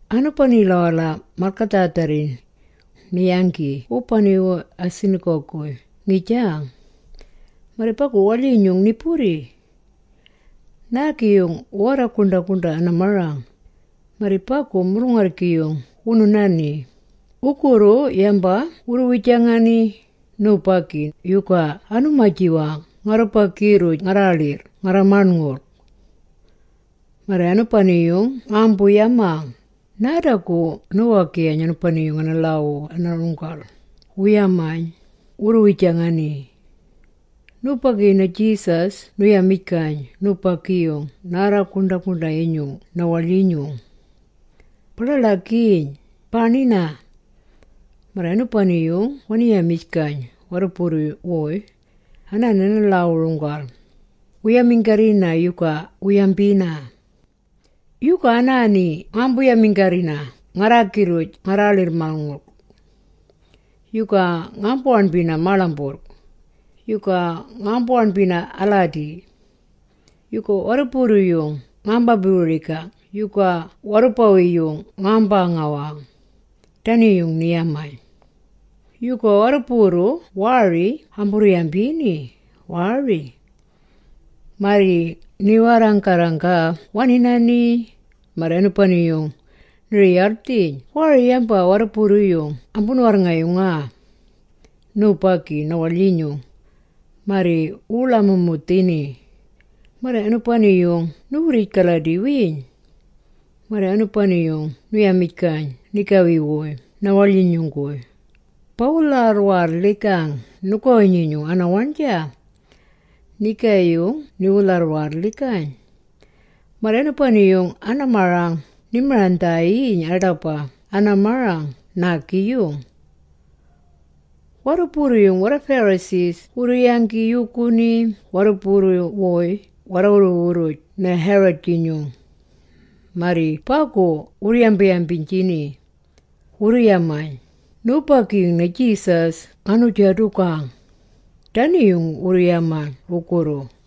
Anubanila-wala malgadhaadharri, ni-yanggi wubani-wuy a-synagog-guy ngijang. Marri bagu waḻyinyung ni-burri. Naagi-yung ni-warra-guṉḏa-guṉḏa a-marang. Marri bagu mulung-arrgi-yung wunu-nani, wugurru yamba wurru-wijangani, “Nubagi yuga anu-maji-wang ngarrubagi-rruj ngarraaḻirr ngarra-maṉngulg? Marri anubani-yung ngaambu-yamang, ‘Naadagu niwu-wagiwayn anubani-yung ana-lhaawu ana-runggal,’” wurru-yamayn, wurru-wijangani. Nubagi-yung na-Jesus nu-yamijgayn nubagi-yung naarra-guṉḏa-guṉḏa-yinyung na-waḻyinyung, “Ba-ḻaḻagiiyn, baaṉina.” Marri anubani-yung wani-yamijgayn warruburru-wuy, “Anaani ana-lhaawu-runggal, wu-yaminggarrina yuga wu-yambina? Yuga anaani ngaambu-yaminggarrina ngarraagi-rruj ngarraaḻirr-maṉngulg? Yuga ngaambu-waṉbina maaḻamburrg, yagu ngaambu-waṉbina aladi? Yuga warrubawi-yung ngaamba-wiri-gang yagu warrubawi-yung ngaamba-ngawijgang?” Dani-yung ni-yamayn. Yagu warruburru waari ambuu-yambini, waari. Marri ni-warra-garranggaa wani-nani, marri anubani-yung ni-riyaldhiyn waari yamba warruburru-yung ambunu-warrngayungaa, nubagi na-waḻyinyung, marri wurru-ḻamumundhini. Marri anubani-yung ni-wurrij-galadi-wiiyn. Marri anubani-yung nu-yamijgayn nigawi-wuy na-waḻyinyung-guy, “Bawu-lharraalhijgang nugawi-nyinyung ana-waṉja.” Nga nigaayung niwu-lharraalhijgayn. Marri anubani-yung ana-marang ni-marang-maṉdhiiyn aḏaba ana-marang naagi-yung. Warruburru-yung warra-Pharisee wurru-yanggi yuuguni warruburru-wuy warra-wurru-wurruj na-Herod-jinyung, marri bagu wurru-yambiynjini. Wurru-yamaa, “Nubagi-yung na-Jesus ngaanu-jadugang.” Dani-yung wurru-yamaa wugurru.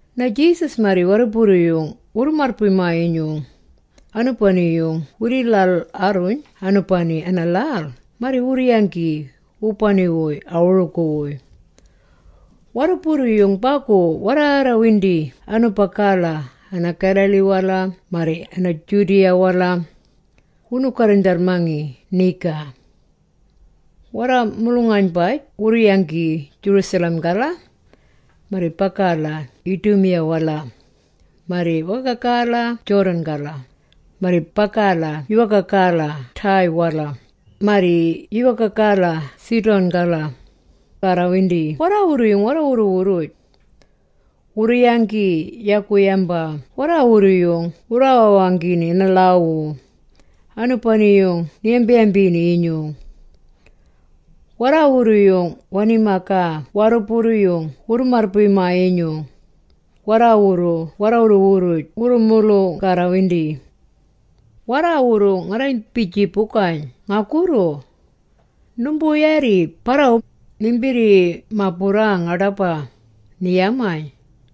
Na-Jesus marri warruburru-yung wurru-marrbuy-maa-yinyung, anubani-yung wii-lhal-warruyn anubani ana-lhal marri wurru-yanggi wubani-wuy a-wurugu-wuy. Warruburru-yung bagu warraarrawindi anubagala ana-Galilee-wala marri ana-Judea-wala, wunu-garrindharrmangi niga. Warra-mulung-aynbaj wurru-yanggi Jerusalem-gala, marri bagala Idumea-wala, marri wagagala-wala Jordan-gala, marri bagala yuwaagala Tyre-wala, marri yuwaagala Sidon-gala, arrawindi warraawurru-yung warra-wurru-wurruj. Wurru-yanggi yagu yamba warraawurru-yung wurraawanggini ana-lhaawu, anubani-yung ni-waṉbini-yinyung. Warraawurru-yung wani-magaa warruburru-yung wurru-marrbuy-maa-yinyung, “Warraawurru warra-wurru-wurruj wurru-mulung-arrawindi. Warraawurru ngarrambi-jiibugayn ngagurru. Numbuu-yaarri barrawu, nimbirrima-burrang aḏaba,” ni-yamayn.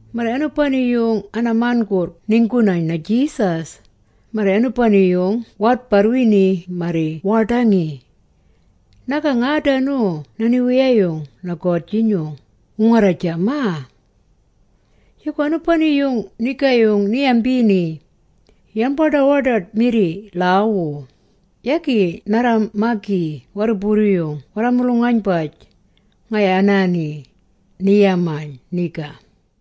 Marri anubani-yung ana-man.gurrg ninggu-nayn na-Jesus, marri anubani-yung waadbarrwini marri waaḏangi, “Nagang aadanu na-Niwiyayung na-God-jinyung!” wu-ngarra-jamaa. Yagu anubani-yung nigaayung ni-yambini, yang-baḏa-waḏaḏ-mirri lhaawu, “Yagi narra-magi warruburru-yung warra-mulung-aynbaj, ngaya anaani,” ni-yamaa niga.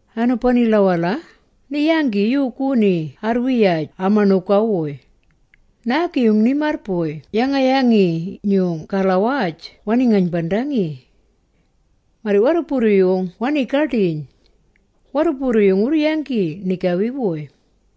Anubanila-wala, ni-yanggi yuuguni arrwiyaj ama-ṉuga-wuy. Naagi-yung ni-marrbuy yanga-yangi-nyung-galawaj wani-ngaynbandangi. Marri warruburru-yung wanii-gaḏiyn. Warruburru-yung wuu-yanggi nigawi-wuy.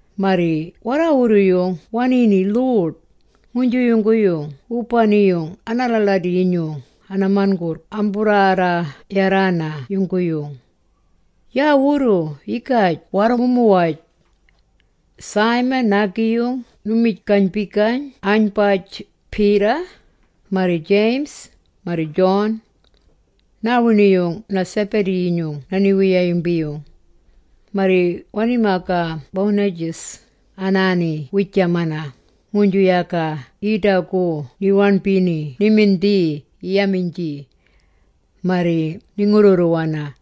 Marri warraawurru-yung waniini lhuḏ, nguynju yungguyung wubani-yung aalaaladi-yinyung a-man.gurrg amburraarra-yarraana yungguyung. Yaawurru yigaj warru-mu-muwaj. Simon, naagi-yung nu-mij-gaynbijgayn anaaynbaj, Peter. Marri James, marri John. Naawiṉi-yung na-Zebedee-yinyung na-niwiyayung-biiyung. Marri wani-mayaa Boanerges, anaani wiijamana, nguynju yaga yiidagu ni-waṉbini ni-mindhii yi-yamiynji, marri ni-ngurrurruwana.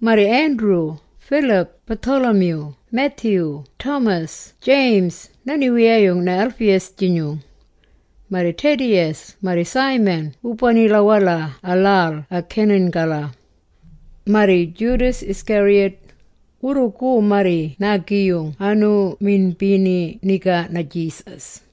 Marri Andrew, Phillip, Bartholomew, Matthew, Thomas, James na-niwiyayung na-Alphaeus-jinyung. Marri Thaddeus marri Simon wubanila-wala a-lhal a-Canaan-gala. Marri Judas Iscariot, wurrugu marri naagi-yung anu-minbini niga na-Jesus.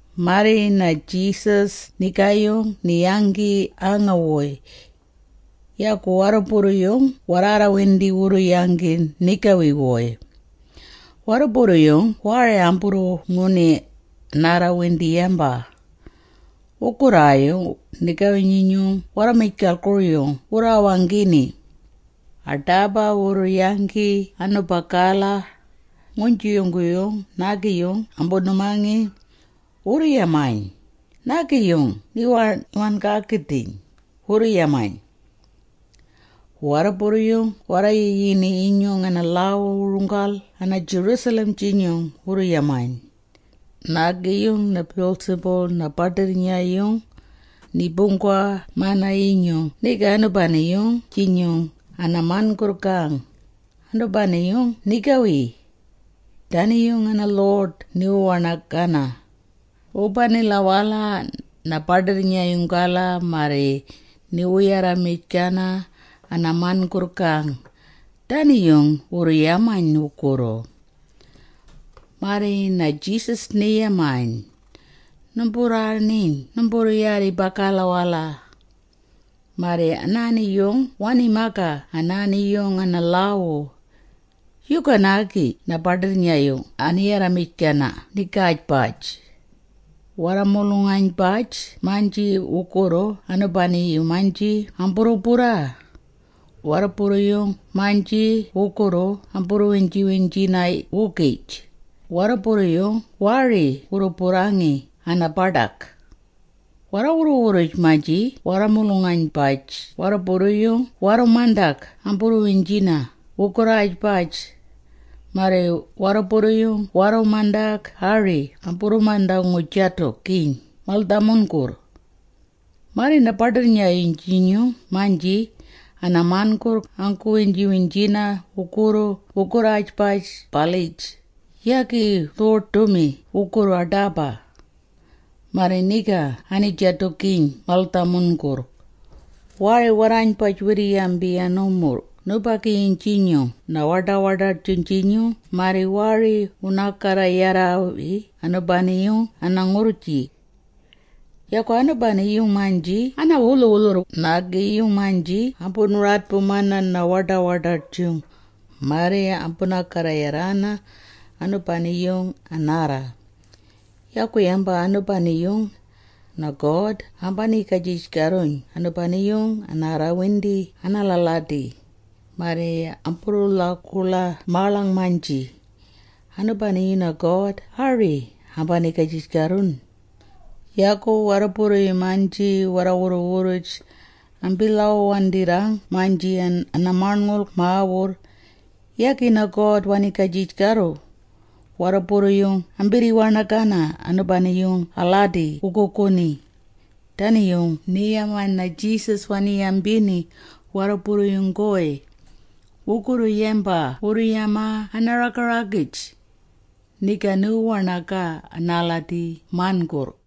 Marri na-Jesus nigaayung ni-yanggi aanga-wuy. Yagu warruburru-yung warraarrawindi wurru-yanggi nigawi-wuy. Warruburru-yung waari amburru-nguni, warraarrawindi yamba. Wugurraayung nigawi-nyinyung warra-mijgalgur-yung wurraawanggini. Aḏaba wurru-yanggi anubagala, nguynju yungguyung naagi-yung ambunu-mangi. Wurru-yamayn, “Naagi-yung ni-wan-gaagidhiyn,” wurru-yamayn. Warruburru-yung warra-yiyini-yinyung ana-lhaawu-runggal ana-Jerusalem-jinyung wurru-yamayn, “Nubagi-yung na-Beelzebul na-baḏirrnya-yung, ni-buunggawa-mana-yinyung niga anubani-yung-jinyung ana-man.gurrg-gaang, anubani-yung nigawi! Dani-yung ana-lhuḏ niwu-waṉagana, wubanila-wala na-baḏirrnya-yung-gala, marri niwu-yarramijgana ana-man.gurrg-gaang.” Dani-yung wurru-yamayn wugurru. Marri na-Jesus ni-yamayn, “Numburraaṉiyn numburru-yaarri bagala.” Marri anaani-yung wani-magaa anaani-yung ana-lhaawu. “Yuga naagi na-baḏirrnya-yung ani-yarramijgina nigaajbaj? Warra-mulung-aynjaabugij-maynji wugurru anubagu-maynji amburru-burraa, warruburru-yung-maynji wugurru amburru-wiynji-wiynjina-wugij, warruburru-yung waari wurru-burrangi ana-baḏag. Warra-wurru-wurruj-maynji warra-mulung-aynjaabugij warruburru-yung warru-mandag amburru-wiynjina wugurraajbaj, marri warruburru-yung warru-mandag ari amburru-manda-ngu-jadugiiyn mal-dhamurrug. Marri na-baḏirrnya-yung-jinyung-maynji ana-man.gurrg anggu-wiynjina wugurru wugurraajbaj-balij, yagi wu-lhuḏ-ḏumi wugurru aḏaba. Marri niga ani-jadugiiyn mal-dhamurrug. “Waari warraaynbaj wirri-yabi ana-wumurrng nubagi-yung-jinyung na-waḏa-waḏaḏ-jung-jinyung marri waari wunaa-garra-yari anubani-yung ana-ngurrji. Yagu, anubani-yung-maynji ana-wulhu-wulhurr nubagi-yung-maynji ambunu-radbumana na-waḏa-waḏaḏ-jung, marri ambunaa-garra-yarina anubani-yung anaarra. Yagu yamba anubani-yung, na-God ambaniigajij-garruyn anubani-yung anaarrawindi anaalaaladi, marri amburru-lhaguḻa-maaḻang-maynji, anubani-yung na-God ari ambaniigajij-garruyn. Yagu warruburru-yung-maynji warra-wurru-wurruj ambii-lhaawu-waandirrang-maynji ana-Maṉngulg Mawurr, yagi na-God waniigajij-garru. Warruburru-yung ambirri-waṉagana anubani-yung anaaladi wuguuguni.” Dani-yung ni-yamaa na-Jesus, wani-yambini warruburru-wuy, wugurru yamba wurru-yamaa ana-raga-ragij, “Niga niwu-waṉagana aladi man.gurrg.”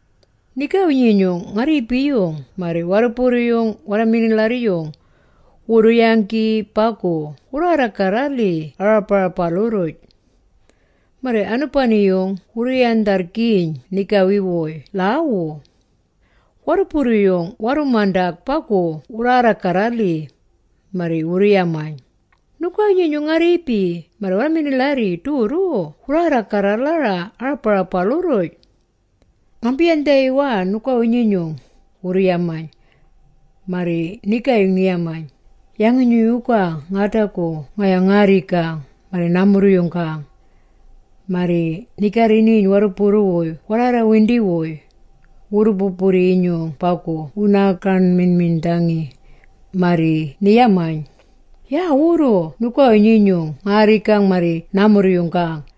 Nigawi-nyinyung nga-rriibi-yung marri warruburru-yung warra-minilharri-yung, wurru-yanggi bagu wurraarra-garra-lhi aaḏabarabalu-rruj. Marri anubani-yung wuu-yandharrgiiyn nigawi-wuy lhaawu. Warruburru-yung warru-mandag bagu wurraarra-garra-lhi, marri wurru-yamayn, “Nugawi-nyinyung nga-rriibi marri warra-minilharri durru wurraarra-garra-lhara aarabarabalu-rruj. Ngambi-yandhawiwana nugawi yungguyung,” wurru-yamayn. Marri nigaayung ni-yamayn, “Yangi-nyung yuga ngaadagi ngaya ngaa-rrigang marri naa-murruyung-gaang?” Marri ni-garri-niiyn warruburru-wuy warraarraarrawindi-wuy, wurru-burri-yinyung bagu wunu-nanggamiṉmiṉḏangi, marri ni-yamayn, “Yaawurru ngayawi-nyinyung nga-rrigang marri naa-murruyung-gaang.